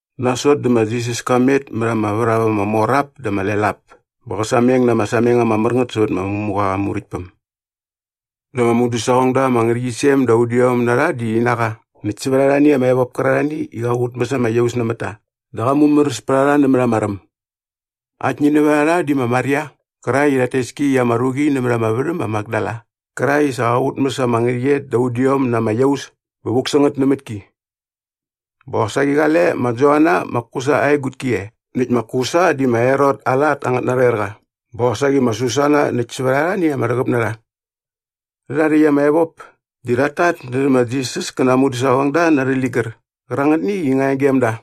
Nasot dä ma Jisas ka met mät ama värhap ama mor ap dä ama lel ap bä qä sameng na ama sameng ama mär ngät sävät ma Ngämuqa aa Muräktpäm. Dä ama mudäsaqongda ama ngärhäqyisem da udiom na rha di rhi na qa näkt sävät arhani ama evop kärarhani i qa qutmäs ama iaus nämät ta dä qa mumäräs pät a rha nämät ama räm. Aktni nävät a rha di ma Maria qärakt i rhat tes ki i ama ruqi nämät ama värhäm ma Makdala qärakt i sa qa qutmäs ama ngärhäqyet da udiom na ama iaus bä vuk sä ngät nämät ki. Bä qosaqi qale ma Joana ma Kusa aa egutki e näkt ma Kusa di ma Herot aa lat angät narhoerqa bä qosaqi ma Susana näkt sävät arhani ama rhäqäp na rha. Rhärha rhäkt ama evop di rhat tatnärhä ma Jisas kä na aa mudäsaqongda na arhä ligär qärangätni i nga e gem da.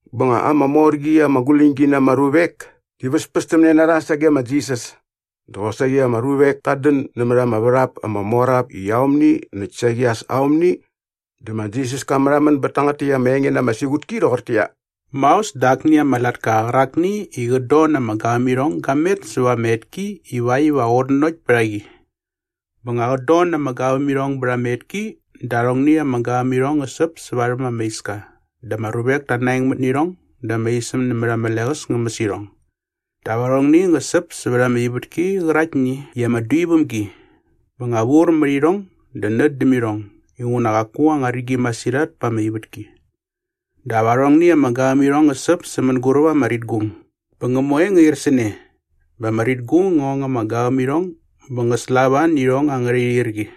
Bä nga ama mor qi ama guläñgi na ama ruvek di väspästämne na rha sage ma Jisas dap kosaqi ama ruvek tat dän nämät ama värhap ama mor ap i aomni näkt saqi sa aomni dä ma Jisas ka märhamän bät tangät täkt ama enge na ama siqutki rhoqortäqyia, “Maos dä akni ama latka qärakni i qät don na ama gavämirhong ga met säva ama etki ivakt iva qä qutnanokt pät a qi. Bä nga qät don na ama gavämirhong bät ama etki dä arhongni ama gavämirhong ngä säp sä varhäm ama iska dä ama ruvek ta naengmät nä irhong dä ama isäm nämät ama leqäs ngä mäs irhong. Dap arhongni ngä säp sävät ama ivätki qäraktni i ama dui väm gi bä nga vur mät irhong dä nät däm irhong inguna qaku anga rigi masirhat pa ama ivätki. Dap arhongni ama gavämirhong ngä säp sä mänguräp ama ritgung bä ngä moe ngä ir sä ne bä ama ritgung ngä ong ama gavämirhong bä ngä slava nä irhong angärha irhirqi.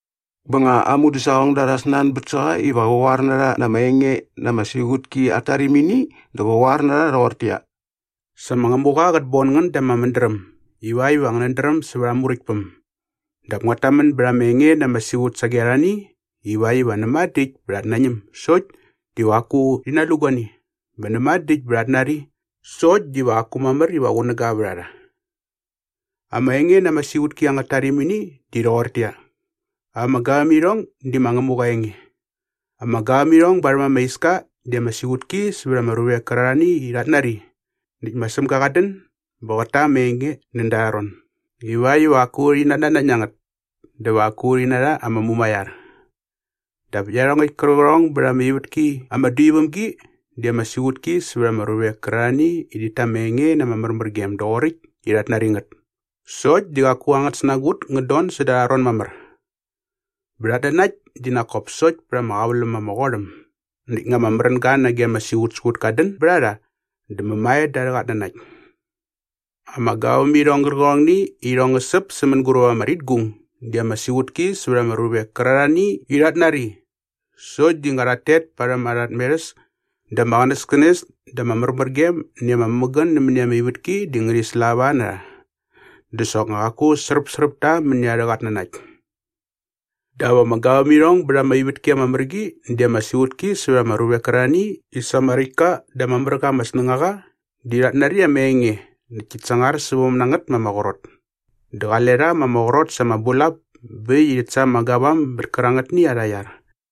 Bä nga aa mudäsaqongda rha snanbät sä qa iva qä qoar na rha na ama enge na ama siqutki at tarimini dä qa qoar na rha rhoqortäqyia, “Sa ma Ngämuqa qät bon ngän da ama mädräm ivakt iva ngänät dräm sävät aa Muräktpäm dap nguat tamän bät ama enge na ama siqut sage arhani ivakt iva ‘näma dä äkt bä rhat nañäm sokt diva qaku rhi nalu guani bä näma dä äkt bä rhat nari sokt diva qaku mamär iva qunäga vät a rha.’ “Ama enge na ama siqutki at tarimini di rhoqortäqyia, ama gavämirhong di ma Ngämuqa aa enge. Ama gavämirhong barhäm ama iska di ama siqutki sävät ama ruvek kärarhani i rhat nari näkt ma Sämga qat dän bä qät ta ama enge näda arha ron ivakt iva qaku rhi natnanakt na ngät dä va qaku rhi narha ama mumaiar. Dap iarhongäkt kärqärhong bät ama ivätki ama dui väm gi di ama siqutki sävät ama ruvek kärarhani i rhit ta ama enge na ama märmärgem doqoräkt i rhat nari ngät sokt di qaku angät snagut ngät don säda arha ron mamär. Bä rhat nanakt di nak kop sokt pät ama qäväläm ama qot äm näkt nga ama märänga nage ama siqutsiqut kat dän bät a rha dä mämae da arhä qatnanakt. “Ama gavämirhong gärqärhongni i irhong ngä säp sä mänguräp ama ritgung di ama siqutki sävät ama ruvek kärarhani i rhat nari sokt di nga rhat tet parhäm arha tmerhäs dä ama qänäskänes dä ama märmärgem näkt ama mämägän nämäni ama ivätki di ngärhi slava na rha dä soknga qaku sräpsräp ta mäni arhä qatnanakt. Dap ama gavämirhong bät ama ivätki ama mär qi di ama siqutki sävät ama ruvek kärarhani i sa ama räkt ka dä ama mär qa ama snängaqa di rhat nari ama enge näkt tit sangar säväm na ngät ma ama qrot. Dä qale rha ma ama qrot sa ama bulap bä äkt i rhit sa ama gavam bät kärangätni arha iar.”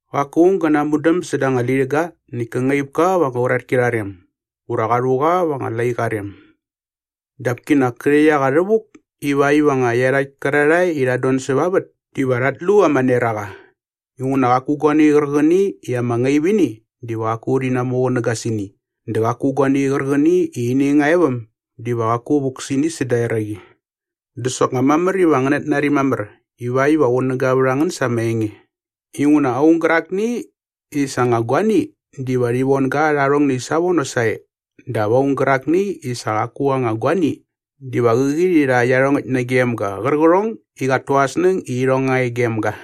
“Qaku aung gä namudäm säda anga lirhäga näkt kä ngaip ka va anga uratki arha rem ura qa rhu qa va anga laiqa aa rem. Dap kinak kä rhäkt a qa rhävuk ivakt iva nga iarhakt kärarhae i rhat don säva vät diva rhat lu ama neraqa. Inguna qaku guani qärqäni i ama ngaip ini diva qaku rhi namuqunäga sä ini dä qaku guani qärqäni i ini nga e väm diva qaku vuk sä ini säda eraqi. Dä soknga mamär iva ngänät nari mamär ivakt iva qunäga vät a ngän sa ama enge inguna aung gärakni i sa aa anga guani diva rhi von ga rha arhongni savono sae dap aung gärakni i sa qaku aa anga guani diva qäqi rhi rha iarhongäkt nagem ga qärqärhong i qat tu aa snäng i irhong nga e gem ga.”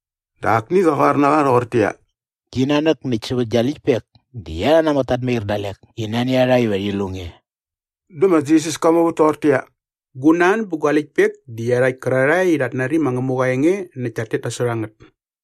Dä akni qa qoar na qa rhoqortäqyia, “Gi nanäk näkt sävät gia läktpek di iarha namäk tat mair dalek i nani a rha iva rhi lu nge.” Dä ma Jisas ka muvät toqortäqyia, “Gu nan bä gua läktpek di iarhakt kärarhae i rhat nari ma Ngämuqa aa enge näkt tat tet nasot a ngät.”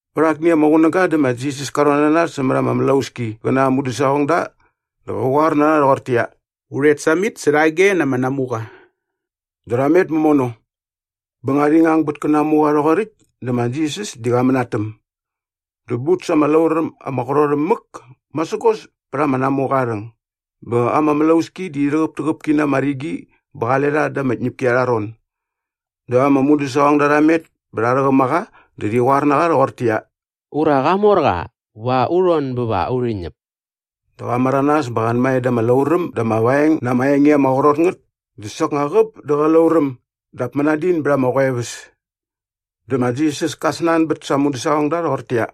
Vät akni ama qunäga dä ma Jisas ka rhon na nas sämät ama mlauski qä na aa mudäsaqongda dä qa qoar na rha rhoqortäqyia, “U rhet samit särhage na ama namuqa.” Dä rha met mämono. Bä nga rhi ngang bät kä namuqa rhoqoräkt dä ma Jisas di qa mänatäm. Dä but sa ama lauräm ama qrot äm mäk masägos pät ama namuqa aa rhäng bä ama mlauski di rhäqäptäqäp ki na ama rigi bä qale rha da ama tñäpki arha ron. Dä ama mudäsaqongda rha met bä rha rhäqäm a qa dä rhi qoar na qa rhoqortäqyia, “Ura, Qamorqa! Va u rhon bä va urhi ñäp!” Dä qa märanas bä qa anmae da ama lauräm dä ama vaeng na ama enge ama qrot ngät dä soknga qäp dä qä lauräm dap mänadin bät ama qoeväs. Dä ma Jisas ka snanbät sa aa mudäsaqongda rhoqortäqyia,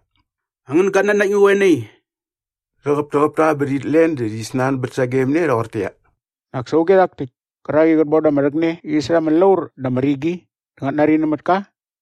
“Angän gatnanakt ngä qoe nai?” Rhäqäptäqäp ta bä rhit len dä rhi snanbät sagem ne rhoqortäqyia, “Nak sa auge rhak täkt kärak i qät bon da ama rhäkne qäqi särha ama laur dä ama rigi dä ngät nari nämät ka?”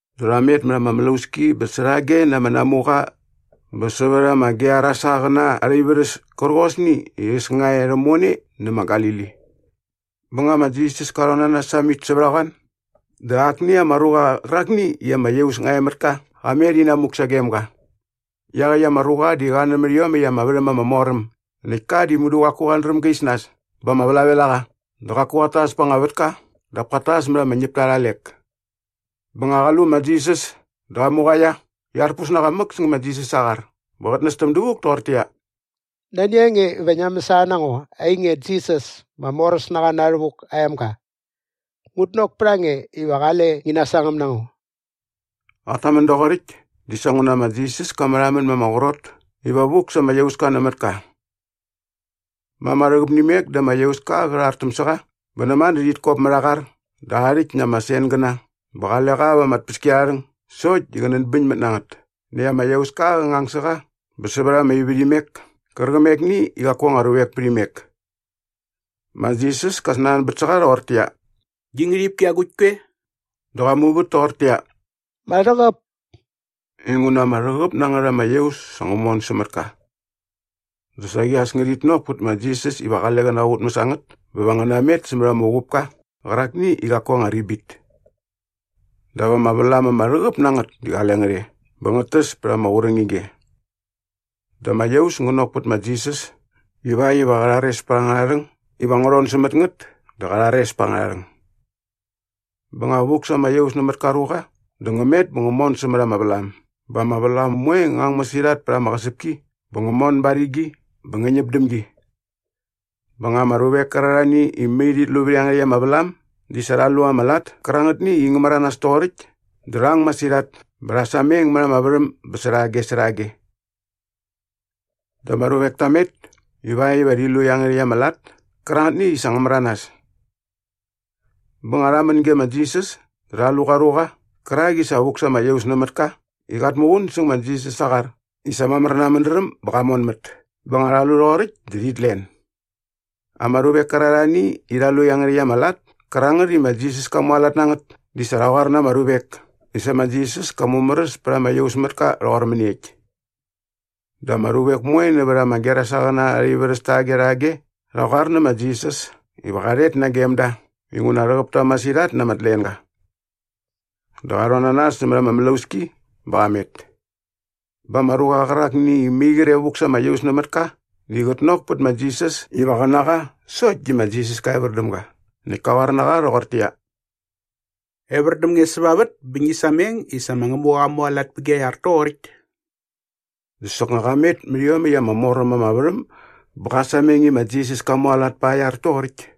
Dä rha met mät ama mlauski bä särhage na ama namuqa bä sävät ama Gerasaqäna arha ivärhäs kärqosni i äs nga e rhämone nä na Galili. Bä nga ma Jisas ka rhon na nas samit sävät a qoan dä akni ama ruqa qärakni i ama iaus nga e mät ka qa met inamuk sagem ga. Iaqäkt ama ruqa di qa nämät iomäkt ama värhäm ama mor äm näkt ka di mudu qaku qat dräm ga is nas bä ama vlavel a qa dä qaku qat tas pa anga vätka dap kat tas mät ama ñäpta arha lek. Bä nga qa lu ma Jisas dä qa muqaia näkt arpus na qa mäk säng ma Jisas aa qar bä qät nästäm dävuk toqortäqyia, “Nani a nge iva ngia mäsana na ngo, ainge Jisas ma Moräsnaqa Na Rhävuk aa emga? Ngut nok pät a nge iva qale ngi nasangäm na ngo.” Qat tamän doqoräkt di sa nguna ma Jisas ka märhamän ma ama qrot iva vuk sa ama iauska nämät ka. Ma ama rhäqäp nä imek dä ama iauska qä rhartäm sä qa bä näma dä rhit kop mät aa qar dä aa rhäkt na ama sengäna bä qale qa va ama tpäskiarharhäng sokt di qä nänbäñmät na ngät näkt ama iauska qä ngang sä qa bä sävät ama ivärhimek kärqämekni i qaku anga ruvek pät imek. Ma Jisas ka snanbät sä qa rhoqortäqyia, “Gi ngärhipki agukt koe?” Dä qa muvät toqortäqyia, “Ma Rhäqäp” inguna ama rhäqäp na ngät ama iaus sa ngä mon sämät ka. Dä saqi as ngärhit nok pät ma Jisas iva qale qä naqutmäs a ngät bä va ngä namet sämät ama uqupka qärakni i qaku aa anga ribit. Dap ama vlam ama rhäqäp na ngät di qale ngät e bä ngät täs pät ama qurängige. Dä ama iaus ngä nok pät ma Jisas ivakt iva qä rhares pät angärha rhäng iva ngä rhon sämät ngät dä qa rhares pät angärha rhäng. Bä nga vuk sa ama iaus nämät ka ruqa dä ngä met bä ngä mon sämät ama vlam bä ama vlam moe ngä ang masirhat pät ama qäsäpki bä ngä mon ba ama rigi bä ngä ñäp däm gi. Bä nga ama ruvek kärarhani i mai rhit lu vät iangärhäkt ama vlam di sa rha lu ama lat kärangätni i ngä märanas toqoräkt dä rha ang masirhat bä rha sameng mät ama värhäm bä särhage särhage. Dä ama ruvek ta met ivakt iva rhi lu iangärhäkt ama lat kärangätni i sa ngä märanas. Bä nga rha män ge ma Jisas dä rha lu qa ruqa qärak i sa vuk sa ama iaus nämät ka i qat muqun säng ma Jisas aa qar i sa mamär na aa mädräm bä qa monmät bä nga rha lu rhoqoräkt dä rhit len. Ama ruvek kärarhani i rha lu iangärhäkt ama lat kärangät i ma Jisas ka mualat na ngät di sa rha qoar na ama ruvek i sa ma Jisas ka mumäräs pät ama iausmätka rhoqor mäniekt. Dä ama ruvek moe nävät ama Gerasaqäna arha ivärhäs taqe rhage rha qoar nä ma Jisas iva qa rhet nagem da inguna rhäqäp ta masirhat na ama tlenga. Dä qa rhon na nas sämät ama mlauski bä qa met. Bä ama ruqa qärakni i mai qre vuk sa ama iaus nämät ka di qät nok pät ma Jisas iva qä na qa dä ma Jisas ka evär däm ga näkt kä qoar na qa rhoqortäqyia, “Evär däm nge säva vät bä ngi sameng i sa ma Ngämuqa qa mualat pä gia iar toqoräkt.” Dä soknga qa met mät iomäkt ama mor äm ama värhäm bä qa sameng i ma Jisas ka mualat pa aa iar toqoräkt.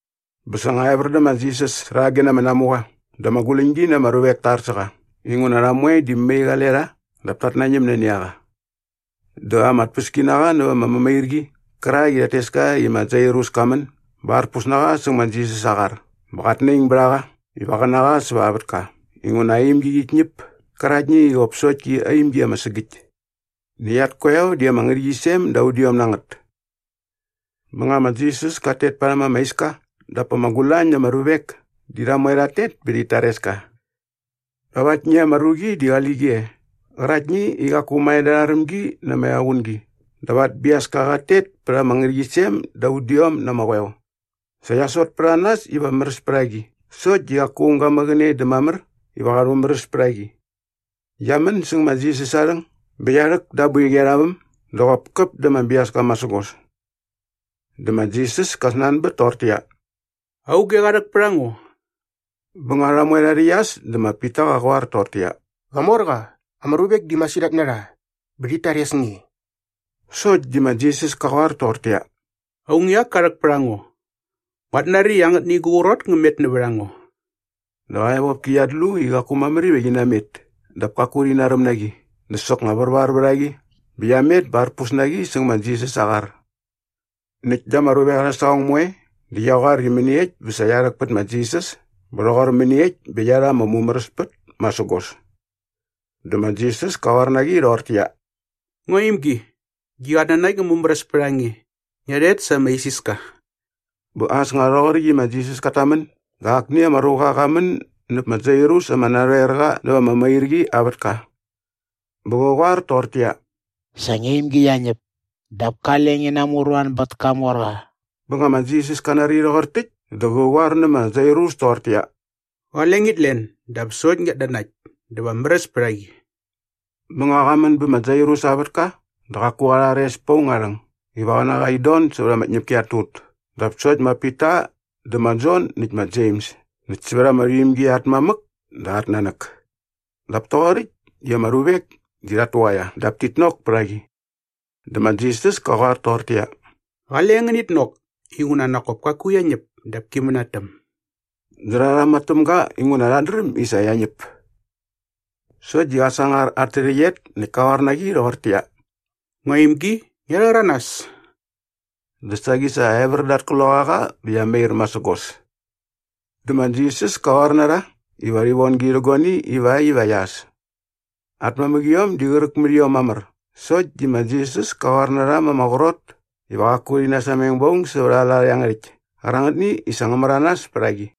Bä sa nga evär dä ma Jisas särhage na ama namuqa dä ama guläñgi na ama ruvek ta ar sä qa inguna rha moe di mai qale rha dap tat nañäm nani a qa. Dä ama tpäskinaqa näva ama mämairqi qärak i rhat tes ka i ma Jairus ka män bä arpus na qa säng ma Jisas aa qar bä qat naing bät a qa iva qä na qa säva aa vätka inguna aa imgi qit ñäp käraktni i qop sokt ki aa imgi ama sägäkt. Näkt at koeo di ama ngärhäqyisem da udiom na ngät. Bä nga ma Jisas kat tet parhäm ama iska dap ama gulañ na ama ruvek di rha moe rhat tet bä rhit tares ka. Dap aktni ama ruqi di qali qi e qäraktni i qaku mae da arha rämgi na ama equngi dap at biaska qat tet pät ama ngärhäqyisem da udiom na ama qoeo. Sa qia sot pät a nas iva märäs pät a qi sokt di qaku aung ga mäqäne dä mamär iva qa rhumäräs pät a qi. Qia män säng ma Jisas aa rhäng bä qia rhäk da aa boiqi arha väm dä qop käp da ama biaska masägos. Dä ma Jisas ka snanbät toqortäqyia, “Auge qa rhäk pät a ngo?” Bä nga rha moe rha rhäqyas dä ma Pita qä qoar toqortäqyia, “Qamorqa, ama ruvek di masirhat na rha bä rhit tares nge.” Sokt di ma Jisas ka qoar toqortäqyia, “Aung i ak ka rhäk pät a ngo. Nguat nari i angätni gu qrot ngä met nävät a ngo.” Dä qa evopki qiat lu i qaku mamär iva qi namet dap kaku rhi naräm na qi dä soknga värvar vät a qi bä qia met bä arpus na qi säng ma Jisas aa qar. Näkt da ama ruvek arhä saqong moe dä qia qoar i mäniekt bä sa qia rhäk pät ma Jisas bä rhoqor mäniekt bä qia rha ama mumäräspät masägos. Dä ma Jisas ka qoar na qi rhoqortäqyia, “Ngua imgi, gi qatnanakt ngä mumäräs pät a nge. Ngia rhet sa ama isiska.” Bä as nga rhoqoräkt i ma Jisas kat tamän dä akni ama ruqa qa män näp ma Jairus ama narhoerqa näva ama mämairqi aa vätka. Bä qä qoar toqortäqyia, “Sa ngia imgi qia ñäp. Dap kale ngi namuruan bät kamorqa.” Bä nga ma Jisas ka nari rhoqor täkt dä qä qoar nä ma Jairus toqortäqyia, “Qale ngit len dap sokt ngiat nanakt dä va märäs pät a rha qi.” Bä nga qa män bä ma Jairus aa vätka dä qaku qa rhares pät aung aa rhäng iva qä na qa in don sävät ama ñäpki at tut dap sokt ma Pita dä ma Jon näkt ma Jems näkt sävät ama rhuimgi at mamäk dä at nanäk. Dap toqoräkt di ama ruvek di rhat tuqaia dap tit nok pät a qi. Dä ma Jisas ka qoar toqortäqyia, “Qale ngänit nok inguna nak kop kaku qia ñäp dap ki mänatäm.” Dä rha rhama täm ga inguna rhat dräm i sa qia ñäp. Sokt di qa sangar at tärhäqyet näkt kä qoar na qi rhoqortäqyia, “Ngua imgi, ngia rhäranas.” Dä saqi sa evär da at kloqaqa bä qia mair masägos. Dä ma Jisas ka qoar na rha iva rhi von gi rhä guani ivakt iva qia äs. At mamäqiom di qräk mät iom mamär sokt di ma Jisas ka qoar na rha ma ama qrot iva qaku rhi nasameng ba aung sävät aa lat iangärhäkt kärangätni i sa ngä märanas pät a qi.